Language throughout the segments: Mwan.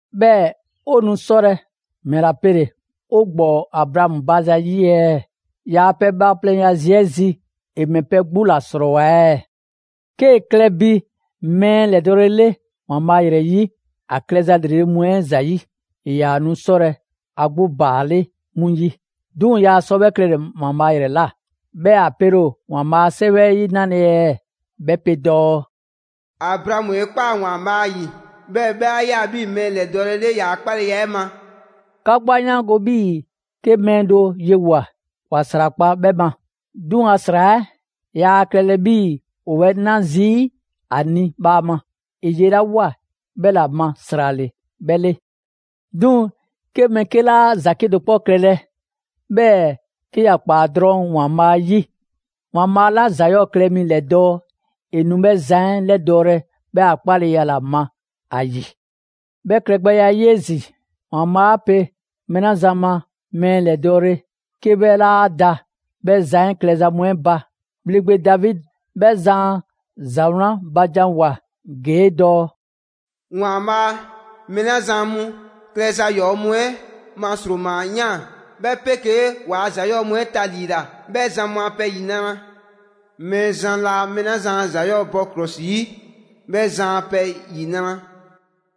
'Bhɛɛ‑ 'o nu 'sɔlɛ‑ ‑mɛla pele‑ 'o ‑gbɔɔ Abraamu ba zayi' ɛɛ? ‑Yaa' pɛ bhaaplɛŋya zi 'ɛ zi, ‑e ‑mɛ pɛ 'gbu ‑la ‑srɔɔwoa ɛɛ? 'Kee‑ klɛ bi mɛɛ ‑lɛdɔɔle 'le ‑Waanbhaa' ‑yrɛ 'yi ‑a klɛza ‑lrele' mu 'ɛ ‑zayi', ‑e ‑yaa nu 'sɔlɛ‑ ‑a 'gbu ‑baale' 'mu 'yi; 'duŋ‑ yaa sɔ 'bhɛ klɛle‑ ‑Waanbhaa' ‑yrɛ ꞊la. 'Bhɛɛ‑ ‑a pele ‑o ‑Waanbhaa' a 'Sɛwɛ 'ɛ 'yi 'nale‑ ɛɛ? 'Bhɛ pe dɔɔ: «Abraamu 'e ꞊kpaa ‑Waanbhaa' 'yi, 'bhɛɛ‑ 'bhɛ 'a ꞊ya 'bhii‑ mɛɛ ‑lɛdɔɔle 'le ‑yaa' 'kpaleya 'ɛ ma.» 'Ka 'gbu 'a 'yaango‑ 'bhii‑ 'ke mɛɛ do yewoa꞊, ‑wa ‑srakpa' 'bhɛ ma. 'Duŋ‑ ‑a ‑sra 'ɛ, yaa klɛlɛ 'bhii‑ ‑o 'bhɛ 'na zii' ‑a ni bhaama; ‑e ye 'la ꞊woa, 'bhɛ ‑la ma ‑sra ‑le 'bhɛ 'le. 'Duŋ‑ 'ke mɛɛ 'ke 'laa ‑za 'kedo‑ 'kpɔ klɛlɛ, 'bhɛɛ‑ 'ke ‑ya ‑kpaa drɔŋ ‑Waanbhaa' 'yi, ‑Waanbhaa' 'la ‑za 'yɔɔ‑ klɛ mi 'lɛdɔɔ‑, ‑e nu 'bhɛ zan 'ɛ ‑lɛdɔɔlɛ 'bhɛ a 'kpaleya ‑la ma ‑a ‑yi. 'Bhɛ klɛgbɛya 'ɛ 'yi 'ezin‑, ‑Waanbhaa' 'a pe mɛɛ 'la zan ma mɛɛ ‑lɛdɔɔle 'ke 'bhɛ 'laa da 'bhɛ zan 'ɛ klɛza mu 'ɛ ba, ‑bhleŋgbe Davidi 'bhɛ zan a ‑za 'wlan ba janwoa‑ ‑gee' dɔɔ: «‑Waanbhaa' mɛɛ 'la zan mu klɛza ‑yɔɔ' mu 'ɛ ma ‑sroma ꞊yaan, 'bhɛ 'pegee 'kee‑ ‑waa ‑za 'yɔɔ‑ mu 'ɛ taliila, 'bhɛ zan mu a pɛ ‑yinra'! Mɛɛzan laa mɛɛ 'la zan a ‑za 'yɔɔ‑ 'ɛ bɔ ‑klɔsi 'yi, 'bhɛ zan a pɛ ‑yinra'!»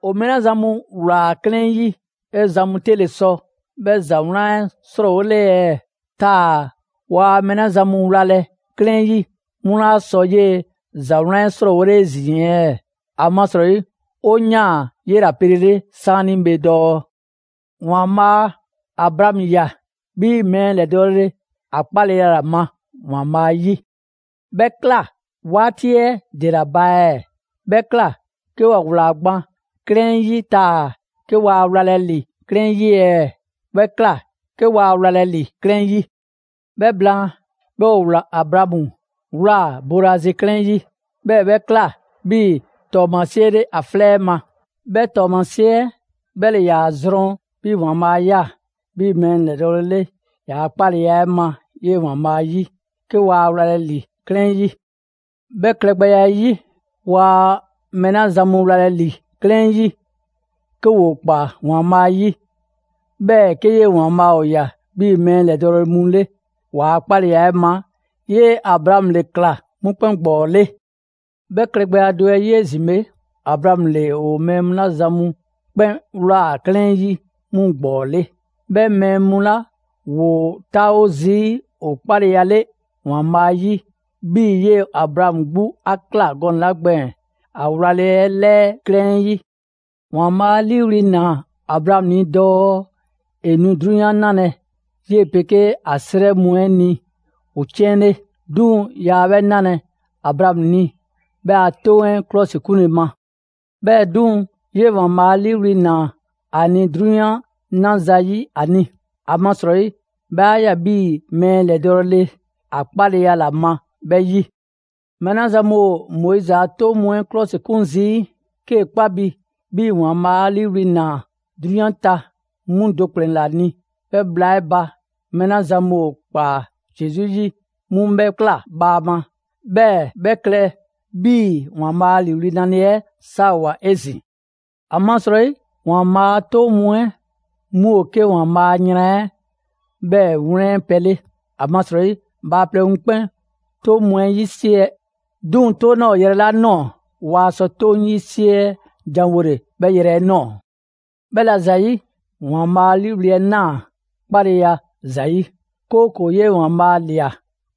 ‑O mɛɛ 'la zan mu ‑wlaa 'klɛɛn 'yi, 'bhɛ zan mu 'te ‑le sɔ 'bhɛ ‑za 'wlan 'ɛ 'srɔɔwole ɛɛ? Taa‑ waa mɛɛ 'la zan mu wlalɛ 'klɛɛn 'yi 'mu 'laa sɔ 'yee‑ ‑za 'wlan 'ɛ 'srɔɔwole 'ezin‑ ɛɛ? ‑Amasrɔyi 'o ꞊yaan 'yela‑ pelele 'saanibhe dɔɔ: «‑Waanbhaa' Abraamu ꞊ya 'bhii‑ mɛɛ ‑lɛdɔɔle ‑a 'kpaleya ‑la ma ‑Waanbhaa' 'yi.» 'Bhɛ ꞊kla 'waati 'ɛ ‑dela ba ɛɛ? 'Bhɛ ꞊kla 'ke ‑wa ꞊wlaa gban 'klɛɛn 'yi taa‑ 'ke waa wlalɛ ‑li 'klɛɛn 'yi ɛɛ? 'Bhɛ ꞊kla 'ke waa wlalɛ ‑li 'klɛɛn 'yi. 'Bhɛ blaan, 'bhɛɛ‑ ‑o Abraamu ꞊wlaa boolazi 'klɛɛn 'yi, 'bhɛɛ‑ 'bhɛ ꞊kla 'bhii‑ ‑tɔɔmasie 'le ‑a 'flɛ 'ɛ ma. 'Bhɛ 'tɔɔmasie 'ɛ 'bhɛ ‑le ‑yaa zrɔn 'bhii‑ ‑Waanbhaa' 'a ꞊ya 'bhii‑ mɛɛ ‑lɛdɔɔle ‑yaa' 'kpaleya 'ɛ ma 'yee‑ ‑Waanbhaa' 'yi, 'ke waa wlalɛ ‑li 'klɛɛn 'yi. 'Bhɛ klɛgbɛya 'ɛ 'yi, waa mɛɛ 'la zan mu wlalɛ ‑li 'klɛɛn 'yi, 'ke ‑woo ‑kpaa ‑Waanbhaa' 'yi, 'bhɛɛ‑ 'ke 'yee‑ ‑Waanbhaa' ‑o ꞊ya 'bhii‑ mɛɛ ‑lɛdɔɔle mu 'le ‑waa' 'kpaleya ma, 'yee‑ Abraamu 'le ꞊kla 'mu 'kpɛn ‑gbɔɔ 'le. 'Bhɛ klɛgbɛya do 'ɛ 'yi 'ezin‑ bhe, Abraamu ‑le ‑o mɛɛ 'la zan mu 'kpɛn ꞊wlaa 'klɛɛn 'yi 'mu ‑gbɔɔ 'le. 'Bhɛ mɛɛ mu 'la ‑woo 'taawo zii' ‑o 'kpalele ‑Waanbhaa' 'yi 'bhii‑ 'yee‑ Abraamu 'gbu 'a ꞊kla gɔnɛ‑ 'la gbɛɛn‑ ‑a wlale 'ɛ 'lɛɛ 'klɛɛn 'yi. ‑Waanbhaa' 'a 'liiwli‑ ‑naa Abraamu ni dɔɔ ‑e nu 'drunyan 'nalɛ‑ 'yee‑ 'pegee ‑a 'srɛ mu 'ɛ ni ‑o 'ciɛn 'le. 'Duŋ‑ yaa 'bhɛ 'nalɛ‑ Abraamu ni 'bhɛ a 'Toŋ 'ɛ 'klɔsikunle ma. 'Bhɛɛ‑ 'duŋ‑, 'yee‑ ‑Waanbhaa' 'a 'liiwli‑ ‑naa ‑a ni 'drunyan 'na zayi' ‑a ni, amasrɔyi 'bhɛ 'a ꞊ya 'bhii‑ mɛɛ ‑lɛdɔɔle ‑a 'kpaleya ‑la ma 'bhɛ 'yi. Mɛɛ 'la zan mu ‑o Moizi a 'toŋ mu 'ɛ 'klɔsikun zii', 'kee‑ 'kpa bi 'bhii‑ ‑Waanbhaa' 'a 'liiwli‑ ‑naa 'drunyan ta 'mu do ‑kplɛn ‑la ni; 'bhɛ bhla 'ɛ ba, mɛɛ 'la zan mu ‑o ‑kpaa Zesu 'yi, 'mu 'bhɛ ꞊kla bhaama, 'bhɛɛ‑ 'bhɛ klɛ 'bhii‑ ‑Waanbhaa' a ‑liiwli' 'nale‑ 'ɛ 'saawoa‑ 'ezin‑. ‑Amasrɔyi Moizi a 'toŋ mu 'ɛ 'mu ‑o 'ke ‑Waanbhaa' a yran 'ɛ 'bhɛɛ‑ 'wlɛn pɛ 'le, ‑amasrɔyi bhaaplɛŋ mu 'kpɛn 'toŋ mu 'ɛ 'yisiɛ‑. 'Duŋ‑ 'toŋ 'laa ‑o yrɛ 'la ꞊nɔɔ, waa sɔ 'toŋ 'yisiɛ janwole 'bhɛ yrɛ 'ɛ ꞊nɔɔ. 'Bhɛla‑ ‑zayi', ‑Waanbhaa' 'a 'liiwli‑ 'ɛ ꞊naa 'kpaleya ‑la ‑zayi', 'kooko‑ 'yee‑ ‑Waanbhaa' ꞊lia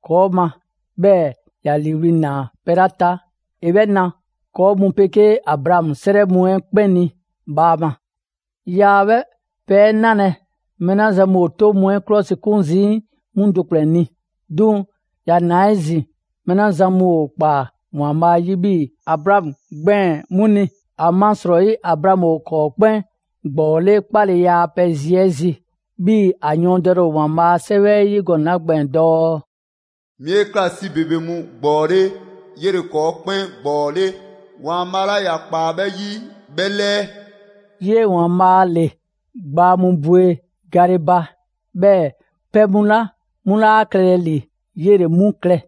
‑kɔɔ' ma, 'bhɛɛ‑ ‑ya ‑liiwli' ꞊naa pɛ 'la ta, ‑e 'bhɛ na ‑kɔɔ' mu 'pegee Abraamu 'srɛ mu 'ɛ 'kpɛn ni bhaama. Yaa 'bhɛ pɛ 'ɛ 'nalɛ‑ mɛɛ 'la zan mu ‑o 'toŋ mu 'ɛ 'klɔsikun zii' 'mu do ‑kplɛn ni. 'Duŋ‑ ‑ya ꞊naa 'ezin‑ mɛɛ 'la zan mu ‑o ꞊kpaa ‑Waanbhaa' 'yi 'bhii‑ Abraamu gbɛɛn‑ 'mu ni. ‑Amasrɔyi Abraamu ‑o ‑kɔɔ' 'kpɛn ‑gbɔɔ 'le 'kpaleya a pɛ zi 'ɛ zi. 'Bhii‑ ‑a yɔɔndɛle ‑o ‑Waanbhaa' a 'Sɛwɛ 'ɛ 'yi gɔnɛ‑ 'la gbɛɛn‑ dɔɔ: «'Mi 'e ꞊kla 'si ‑bebe mu ‑gbɔɔ 'le. 'Yele‑ ‑kɔɔ' 'kpɛn ‑gbɔɔ 'le ‑Waanbhaa' 'la ‑ya ꞊kpaa 'bhɛ 'yi 'bhɛ 'lɛɛ.» 'Yee‑ ‑Waanbhaa' ‑le gbaa mu bwe gale ba, 'bhɛɛ‑ pɛ mu 'la 'mu 'laa klɛlɛ ‑li, 'yele‑ 'mu klɛ.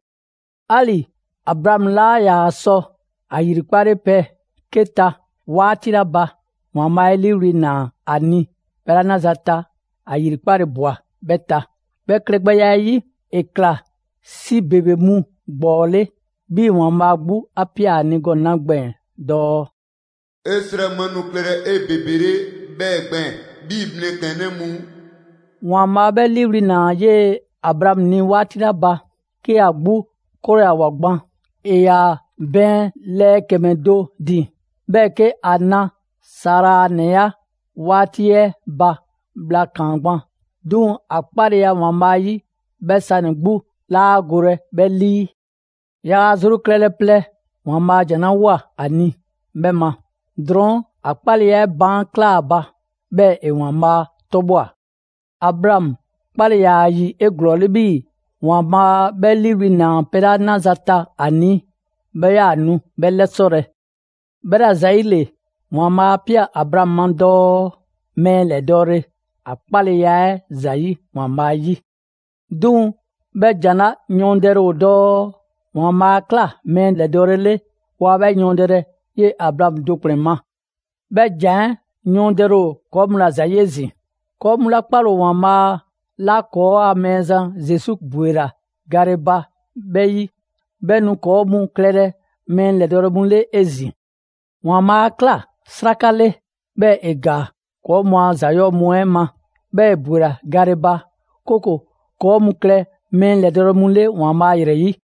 'Ali‑ Abraamu 'laa ‑yaa sɔ ‑a 'yrikpale pɛ 'ke ta 'waati 'la ba, ‑Waanbhaa' 'e 'liiwli‑ ꞊naa ‑a ni pɛ 'la 'naza‑ ta, ‑a ‑yrikpale ꞊bwa 'bhɛ ta. 'Bhɛ klɛgbɛya 'ɛ 'yi, ‑e ꞊kla «'Si ‑bebe mu ‑gbɔɔ 'le». 'Bhii‑ ‑Waanbhaa' 'gbu 'a ꞊pia ‑a ni gɔnɛ‑ 'la gbɛɛn‑ dɔɔ: «'E 'srɛ mu 'ɛ nu klɛlɛ 'ebebele 'bhɛɛ‑ gbɛɛn‑ 'bhii‑ mlɛklɛnnɛ mu.» ‑Waanbhaa' 'bhɛ 'liiwli‑ ꞊naa 'yee‑ Abraamu ni 'waati 'la ba, 'ke ‑a 'gbu 'krɔyawoa gban; ‑e ‑yaa bɛɛn lɛɛ ‑kɛmɛ do ‑din, 'bhɛɛ‑ 'ke ‑a na Sara a ‑nɛya' 'waati 'ɛ ba bhla ‑kaan gban. 'Duŋ‑ ‑a 'kpaleya 'ɛ ‑Waanbhaa' 'yi, 'bhɛ sanɛ‑ 'gbu 'laa golɛ 'bhɛ 'lii. Yaa ‑a zru klɛlɛ plɛ ‑Waanbhaa' ‑jan 'la ꞊woa ‑a ni 'bhɛ ma. Drɔɔn' ‑a 'kpaleya 'ɛ baan' ꞊klaa ‑a ba, 'bhɛɛ‑ ‑e ‑Waanbhaa' 'tɔbhwa‑. Abraamu 'kpale‑ ‑yaa ‑a ‑yi 'eglɔɔle 'bhii‑ ‑Waanbhaa' 'bhɛ 'liiwli‑ ‑naa pɛ 'la 'naza‑ ta ‑a ni, 'bhɛ 'yaa‑ nu 'bhɛ 'lɛsɔlɛ. 'Bhɛla‑ ‑zayile, ‑Waanbhaa' 'a ꞊pia Abraamu ma dɔɔ: «Mɛɛ ‑lɛdɔɔle» ‑a 'kpagbɛya 'ɛ ‑zayi' ‑Waanbhaa' 'yi. 'Duŋ‑ 'bhɛ ‑jan 'la yɔɔndɛle ‑o dɔɔ: «‑Waanbhaa' 'a ꞊kla mɛɛ ‑lɛdɔɔle 'le». Waa 'bhɛ yɔɔndɛlɛ 'yee‑ Abraamu do ‑kplɛn ma. 'Bhɛ ‑jan 'ɛ yɔɔndɛle ‑o ‑kɔɔ' mu ‑la ‑zayi' 'ezin‑. ‑Kɔɔ' mu 'la 'kpale‑ ‑o ‑Waanbhaa' 'la ‑kɔɔa' Mɛɛzan Zesu ‑bwela gale ba 'bhɛ 'yi, 'bhɛ nu ‑kɔɔ' mu klɛlɛ mɛɛ ‑lɛdɔɔle mu 'le 'ezin‑. ‑Waanbhaa' 'a ꞊kla 'sraka 'le, 'bhɛɛ‑ ‑e ‑gaa ‑kɔɔ' mu a ‑za 'yɔɔ‑ mu 'ɛ ma; 'bhɛɛ‑ ‑e ‑bwela gale ba, 'kooko‑ ‑kɔɔ' mu klɛ mɛɛ ‑lɛdɔɔle mu 'le ‑Waanbhaa' ‑yrɛ 'yi.